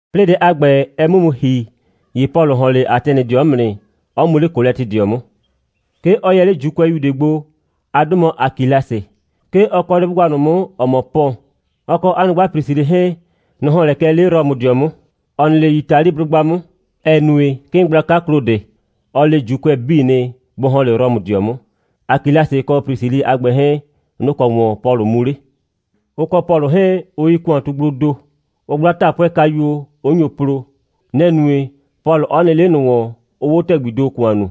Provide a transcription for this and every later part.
'Plɩɩ dɛ a ‑gbɛ, ɛ 'mʋ mu ‑hi, ‑ye Pɔlʋ ‑hɔn 'le Atɛnɩdɩɔ 'mʋ nɩ, 'ɔ mu 'le Kolɛtɩdɩɔ 'mʋ. 'Ke ɔ yɛ 'le ‑Juukʋɛyu ꞊de gbo. 'A 'dʋ mɔ Akilasɩ. 'Ke ɔ kɔ 'le 'blʋgba ꞊nʋ 'mʋ, ‑ɔ mɔ Pɔn. Ɔ kɔ 'a nyrʋgba Prisilɩ 'hɛɛn, nʋ‑ ‑hɔn lɛ kɛ 'le Rɔmʋdɩɔ 'mʋ, ‑ɔ nɩ 'le Yitaliblʋgba 'mʋ, ‑ɛ nue, 'kɩɩn gblaka Klodɩ, ɔ le ‑Juukʋɛ 'bii nɩ, bʋ ‑hɔn 'le Rɔmʋdɩɔ 'mʋ. Akilasɩ kɔ Prisilɩ a ‑gbɛ 'hɛɛn, nʋ‑ kɔ ‑wɔn Pɔlʋ mu 'le. Ʋ kɔ Pɔlʋ 'hɛɛn, ʋ yi ‑kʋantugbloo ‑do. Ʋʋ 'gbla 'taapʋɛkayuo, 'ʋ nyo plo. Nɛ‑ nue, Pɔlʋ 'ɔ nɩ 'le ꞊nʋ ‑wɔn, 'ʋʋ 'o ‑tɛgbii ‑do ‑kʋan nuu.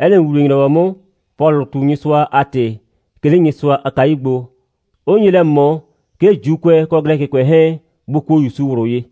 'Ɛ nɩ ‑wuwle‑nyrɔwɔ 'mʋ, Pɔlʋʋ ꞊tu Nyɩsʋa a ‑tɩ, 'ke 'le Nyɩsʋa a kayu gbo, 'ʋ nye lɛ ꞊mɔ, 'ke ‑Juukʋɛ kɔ Glɛkɩkʋɛ 'hɛɛn, bʋ kuo ‑Yusu ꞊wlʋ ye.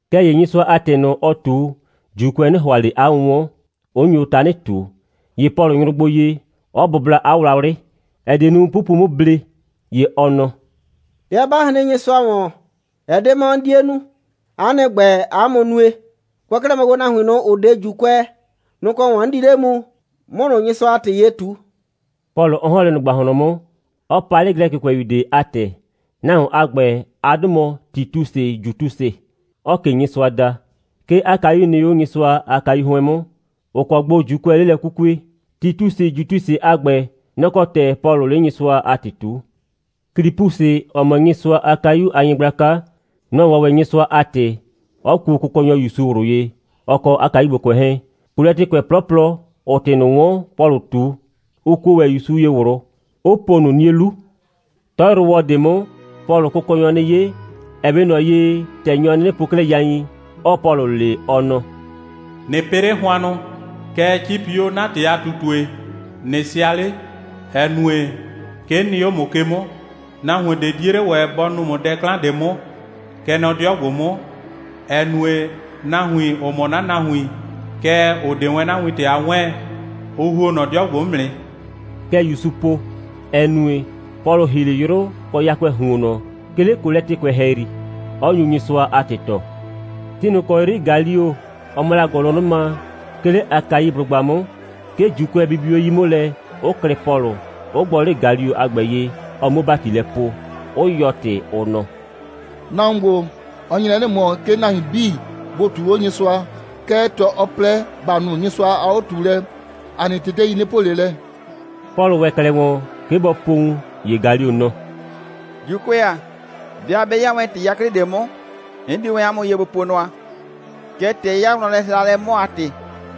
Kɛɛ ‑ye Nyɩsʋa a ‑tɩ ꞊nʋ, ɔɔ ꞊tu, ‑Juukʋɛ 'nɩ ‑hʋa ꞊le 'a 'wʋnwɔn, 'ʋ nyo tanɩ ꞊tu. ‑Ye Pɔlʋ nyrʋ gbo ye, 'ɔ bʋbla 'a wlawlɩ, ‑ɛ die nu, 'pupu 'mʋ ble, ‑ye ɔ nɔ: «'Bɩa 'ba hren Nyɩsʋa ‑wɔn, ɛ 'de 'mɔ 'n 'die nu. 'A nɩ ‑gbɛ, 'a mʋ nue. Kʋɛ kɛ 'klɛɛ mɔ gbo, nahuin ꞊nʋ, ‑ʋ 'de ‑Juukʋɛ, nʋ‑ kɔ ‑wɔn 'n di 'le mu, 'mʋ ꞊nʋ Nyɩsʋa a ‑tɩ ye ꞊tu,» Pɔlʋ 'ɔ ‑hɔn 'le ꞊nʋ ‑gbahlɔn 'mʋ, 'ɔ pa 'le Glɛkɩkʋɛyu ꞊de a ‑tɛ. Nahuon a ‑gbɛ, 'a 'dʋ mɔ Titusɩ Jutusɩ, 'ɔɔ ꞊ke Nyɩsʋa da. 'Ke 'a kayu nɩ 'o Nyɩsʋa a kayu 'hʋɩn 'mʋ, ‑ʋ kɔ gbo ‑Juukʋɛ 'le lɛ 'kukue. Titusɩ Jutusɩ a ‑gbɛ, nɔ‑ kɔ ‑tɛ Pɔlʋʋ 'le Nyɩsʋa a ‑tɩ ꞊tuu. Klipusɩ, ‑ɔ mɔ Nyɩsʋa a kayu a nyɩgblaka, nɔ‑ 'wɔn ‑wɛ Nyɩsʋa a ‑tɩ, 'ɔ kuo Kʋkɔnyɔ ‑Yusu ꞊wlʋ ye, ɔ kɔ 'a kayugbokʋɛ 'hɛɛn. Kolɛtɩkʋɛ 'plɔplɔ, ‑ʋʋ ‑tɩ ꞊nʋ 'wɔn, Pɔlʋʋ ꞊tu, ʋ kuo ‑wɛ ‑Yusu ye ꞊wlʋ, 'ʋ po ꞊nʋ 'nie 'lu. 'Tɔyrʋwɔ ꞊de 'mʋ, Pɔlʋʋ Kʋkɔnyɔ 'nɩ 'ye, ‑ɛ 'we ꞊nɔ ye, ‑tɛ nyɔ 'nɩnɩ po 'klɛɛ yain, 'ɔɔ Pɔlʋ le, ɔ nɔ: «꞊Nɩ pɩ 'le hʋannʋ, kɛɛ, 'cipi 'o 'na ‑tɩ a ꞊tutue, ꞊nɩ sɩa 'le, ‑ɛ nue, 'ke 'n nɩ 'o ‑mʋ ke 'mʋ. Nahuon ꞊de 'die 'le ‑wɛ bɔ nu ‑mʋ dɛ 'klan ꞊de 'mʋ, kɛ nɔ 'dɩɔ ‑gbo 'mʋ, ‑ɛ nue, nahuin, ‑ʋ mɔ 'na nahuin, kɛɛ, ‑ʋ 'de wɛn 'na wintɛ a 'wɛɛn, ʋ ‑huo nɔ 'dɩɔ ‑gbo 'mʋ nɩ.» Kɛ ‑Yusu po. Ɛ nue, Pɔlʋ 'ɔ ‑hi 'le 'yrʋ kɔ yakʋɛɛ ‑huonnɔ, 'ke 'le Kolɛtɩkʋɛ ‑hɛyri, 'ɔ nyu Nyɩsʋa a ‑tɩ tɔɔ. Ti ꞊nʋ ‑kɔ 'yri Galio, ɔ mɔ la ‑gʋlʋnʋma, 'ke 'le Akaiblʋgba 'mʋ, 'ke ‑Juukʋɛ bibi 'o 'yi 'mʋ lɛ, 'ʋ klɩ Pɔlʋ, 'ʋ gbɔ 'le Galio a ‑gbɛ ye, ɔ 'muo ‑bati lɛ poo, 'ʋ yɔɔ ‑tɩ, ʋ nɔ: «Nahuon ‑gbo, ɔ nye lɛ 'nɩ ꞊mɔ, 'ke nahuin 'bii bʋ ꞊tuu 'o Nyɩsʋa. Kɛɛ, ‑tɛ ɔ plɛ, ‑ba nu Nyɩsʋa a 'o꞊tuulɛ, ‑a nɩ tetei 'nɩ po ꞊le lɛ.» Pɔlʋ ‑wɛ 'klɛɛ ‑wɔn, 'ke bɔ po wun, ‑ye Galio nɔ: «‑Juukʋɛ ‑a, 'bɩa 'bɛ 'ya wɛn ‑tɩ 'yaklɩ ꞊de 'mʋ, 'n di wɛn 'a mʋ ye gbo po nʋa. Kɛɛ, ‑tɛ ɛ 'ya wlɔnlɛhɩhralɛ 'mʋ a ‑tɩ,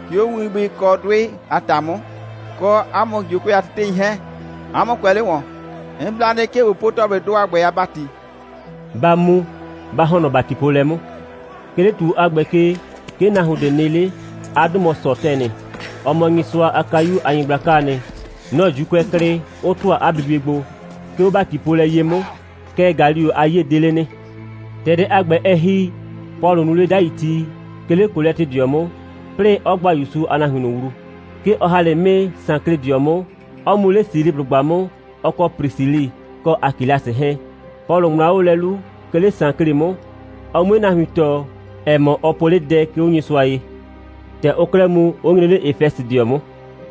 'ke 'o winbʋɩ kɔ 'dʋɩ a ‑ta 'mʋ, kɔ 'a mʋ ‑Juukʋɛ a tetei 'hɛɛn, 'a mʋ kʋɛ 'le ‑wɔn. 'N bla nɩ, 'ke ꞊bo po ‑tɔplɩdʋ a ‑gbɛ a ‑bati. Ba mu, ba ‑hɔn nɔ ‑batipoolɛ 'mʋ.» 'Ke 'le ‑tuo a ‑gbɛ ke, 'ke nahuon ꞊de nɩ 'le. 'A 'dʋ mɔ Sɔtɛnɩ. Ɔ mɔ Nyɩsʋa a kayu a nyɩgblakaa nɩ. Nɔ‑ ‑Juukʋɛ klɩ, 'ʋ ‑tʋa 'a bibie gbo, 'ke 'o ‑batipoolɛ ye 'mʋ. Kɛɛ, Galio a 'yie 'de 'le nɩ. ‑Tɛ dɛ a ‑gbɛ, ɛ ‑hi, Pɔlʋ nuu 'le 'dai ti, 'ke 'le Kolɛtɩdɩɔ 'mʋ, 'plɩɩ 'ɔ gba ‑Yusu a nahuin ꞊nʋ wlu. 'Ke ɔ ‑ha 'le 'mɩɩ Sankledɩɔ 'mʋ, 'ɔ mu 'le Siliblʋgba 'mʋ, ɔ kɔ Prisilɩ kɔ Akilasɩ 'hɛɛn. Pɔlʋ ŋmlaa 'o 'a 'lu lɛ, 'ke 'le Sankle 'mʋ, ɔ 'mue nahuin tɔɔ, ‑ɛ mɔ, ɔ po 'le dɛ, 'ke 'o Nyɩsʋa ye. ‑Tɛ ʋʋ 'klɛɛ mu, ʋ nyre 'le Efɛsɩdɩɔ 'mʋ.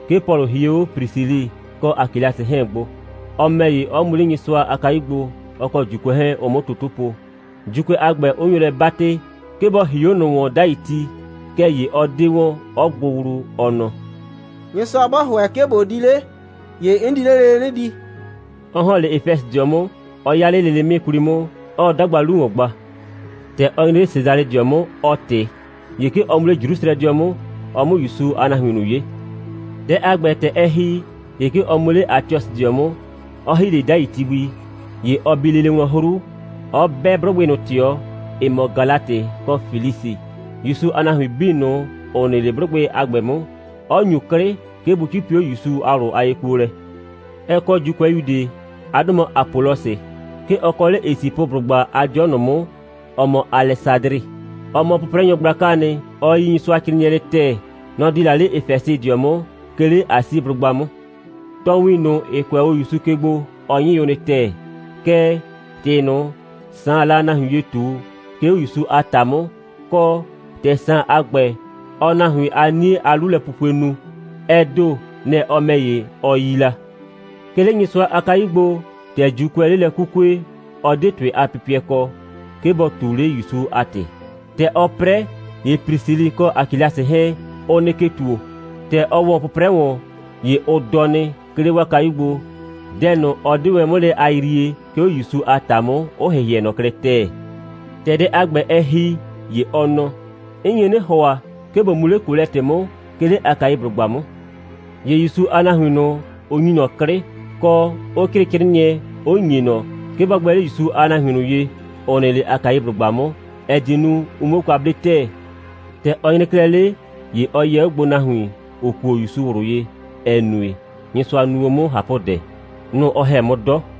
'Ke Pɔlʋ hie 'o Prisilɩ kɔ Akilasɩ 'hɛɛn gbo, ɔ ‑mɛ ‑ye, 'ɔ mu 'le Nyɩsʋa a kayu gbo, ɔ kɔ ‑Juukʋɛ 'hɛɛn, ʋ 'mʋ toto po, ‑Juukʋɛ a ‑gbɛ, 'ʋ nyo lɛ 'batɩ, 'ke bɔ ‑hi 'o ꞊nʋ ‑wɔn 'dai ti, kɛɛ ‑ye ɔ 'de wɔn, 'ɔ gbʋ wlu, ɔ nɔ: «Nyɩsʋa 'bɔ ‑hʋɛ, 'ke ꞊bo di 'le, ‑ye 'n di 'le lele 'nɩ di,» 'ɔ ‑hɔn 'le Efɛsɩdɩɔ 'mʋ, 'ɔ 'ya 'le lele 'mɩɩ 'kwli 'mʋ, 'ɔɔ 'dagba 'lu ‑wɔn gba. ‑Tɛ ɔ nyre 'le Sesalɩdɩɔ 'mʋ, ɔ ꞊tɩ, ‑ye 'ke ɔ mu 'le Jrusrɛdɩɔ 'mʋ, ɔ 'mʋ ‑Yusu a nahuin ꞊nʋ 'ye. Dɛ a ‑gbɛ, ‑tɛ ɛ ‑hi, ‑ye 'ke ɔ mu 'le Atiɔsɩdɩɔ 'mʋ, 'ɔ ‑hi 'le 'dai ti gbi. ‑Ye ɔ bi lele wlɔn 'hru, 'ɔ 'bɛ 'blʋgbɩ ꞊nʋ ꞊tɩɔ, ‑ɩ mɔ Galatɩ kɔ Flisi, ‑Yusu a nahuin 'bii ꞊nʋ, ‑ʋ nɩ 'le 'blʋgbɩ a ‑gbɛ 'mʋ, 'ɔ ‑nyu 'klɩ, 'ke bʋ 'cipi 'o ‑Yusu a ꞊wlʋ a yekuolɛ. Ɛ kɔ ‑Juukʋɛyu ꞊de. 'A 'dʋ mɔ Apɔlɔsɩ. 'Ke ɔ kɔ 'le Esipʋblʋgba a 'dɩɔ ꞊nʋ 'mʋ, ‑ɔ mɔ Alɛsadrɩ. Ɔ mɔ 'pʋprɛnyɔ gblakaa nɩ. Ɔ yi Nyɩsʋacrɩɩnɩɛ nɩ ‑tɛɛ. Nɔ‑ di la 'le Efɛsɩdɩɔ 'mʋ, 'ke 'le Asiblʋgba 'mʋ. Tɔɔwin ꞊nʋ, ‑ɩ kʋɛ 'o ‑Yusu ke gbo, ɔ 'nyɩ o nɩ ‑tɛɛ. Kɛɛ, ‑tɩ ꞊nʋ, Saan la nahuin ye ꞊tu, 'ke 'o ‑Yusu a ‑ta 'mʋ, kɔ, ‑tɛ Saan a ‑gbɛ, ɔɔ nahuin a 'nie a 'lulɛpupue nu, ɛ ‑do, nɛ‑ ɔ ‑mɛ ‑ye, ɔ yi la. 'Ke 'le Nyɩsʋa a kayu gbo, ‑tɛ ‑Juukʋɛɛ 'le lɛ 'kukue, ɔ 'de ‑tʋɩ a pɩpɩɛ kɔ, 'ke bɔ ꞊tu 'le ‑Yusu a ‑tɩ. ‑Tɛ ɔɔ 'prɛ, ‑ye Prisilɩ kɔ Akilasɩ 'hɛɛn, ʋ nɩ ke ‑tuo. ‑Tɛ ɔ ‑wɔ 'pʋprɛ ‑wɔn, ‑ye ʋ dɔ nɩ, 'ke 'le 'waa kayu gbo, dɛ ꞊nʋ, ɔ 'de wɛn 'mʋ lɛ a yrie, 'ke 'o ‑Yusu a ‑ta 'mʋ, 'ʋ ‑hɩhɩɛ ꞊nɔ klɛ ‑tɛɛ. ‑Tɛ dɛ a ‑gbɛ, ɛ ‑hi, ‑ye ɔ nɔ: «'N nye 'nɩ ‑hʋa, 'ke ꞊bo mu 'le Kolɛtɩ 'mʋ, 'ke 'le Akaiblʋgba 'mʋ.» ‑Ye ‑Yusu a nahuin ꞊nʋ, ʋ ‑nyi ꞊nɔ 'klɩ, kɔ, 'ʋ 'crɩɩ 'crɩɩnɩɛ, 'ʋ ‑nye ꞊nɔ, 'ke bɔ gbɛ 'le ‑Yusu a nahuin ꞊nʋ ye, ‑ʋ nɩ 'le Akaiblʋgba 'mʋ, ‑ɛ die nu, ʋ 'muo kwa 'ble ‑tɛɛ. ‑Tɛ ɔ nyre 'klɛɛ 'le, ‑ye ɔ yɛ 'o gbo nahuin, ‑ʋ kuo o ‑Yusu ꞊wlʋ ye, ‑ɛ nue, Nyɩsʋa nu o ꞊nʋ 'mʋ ꞊hapʋdɛ. Nʋ‑ ɔ ‑hɛ 'mʋ 'dɔ,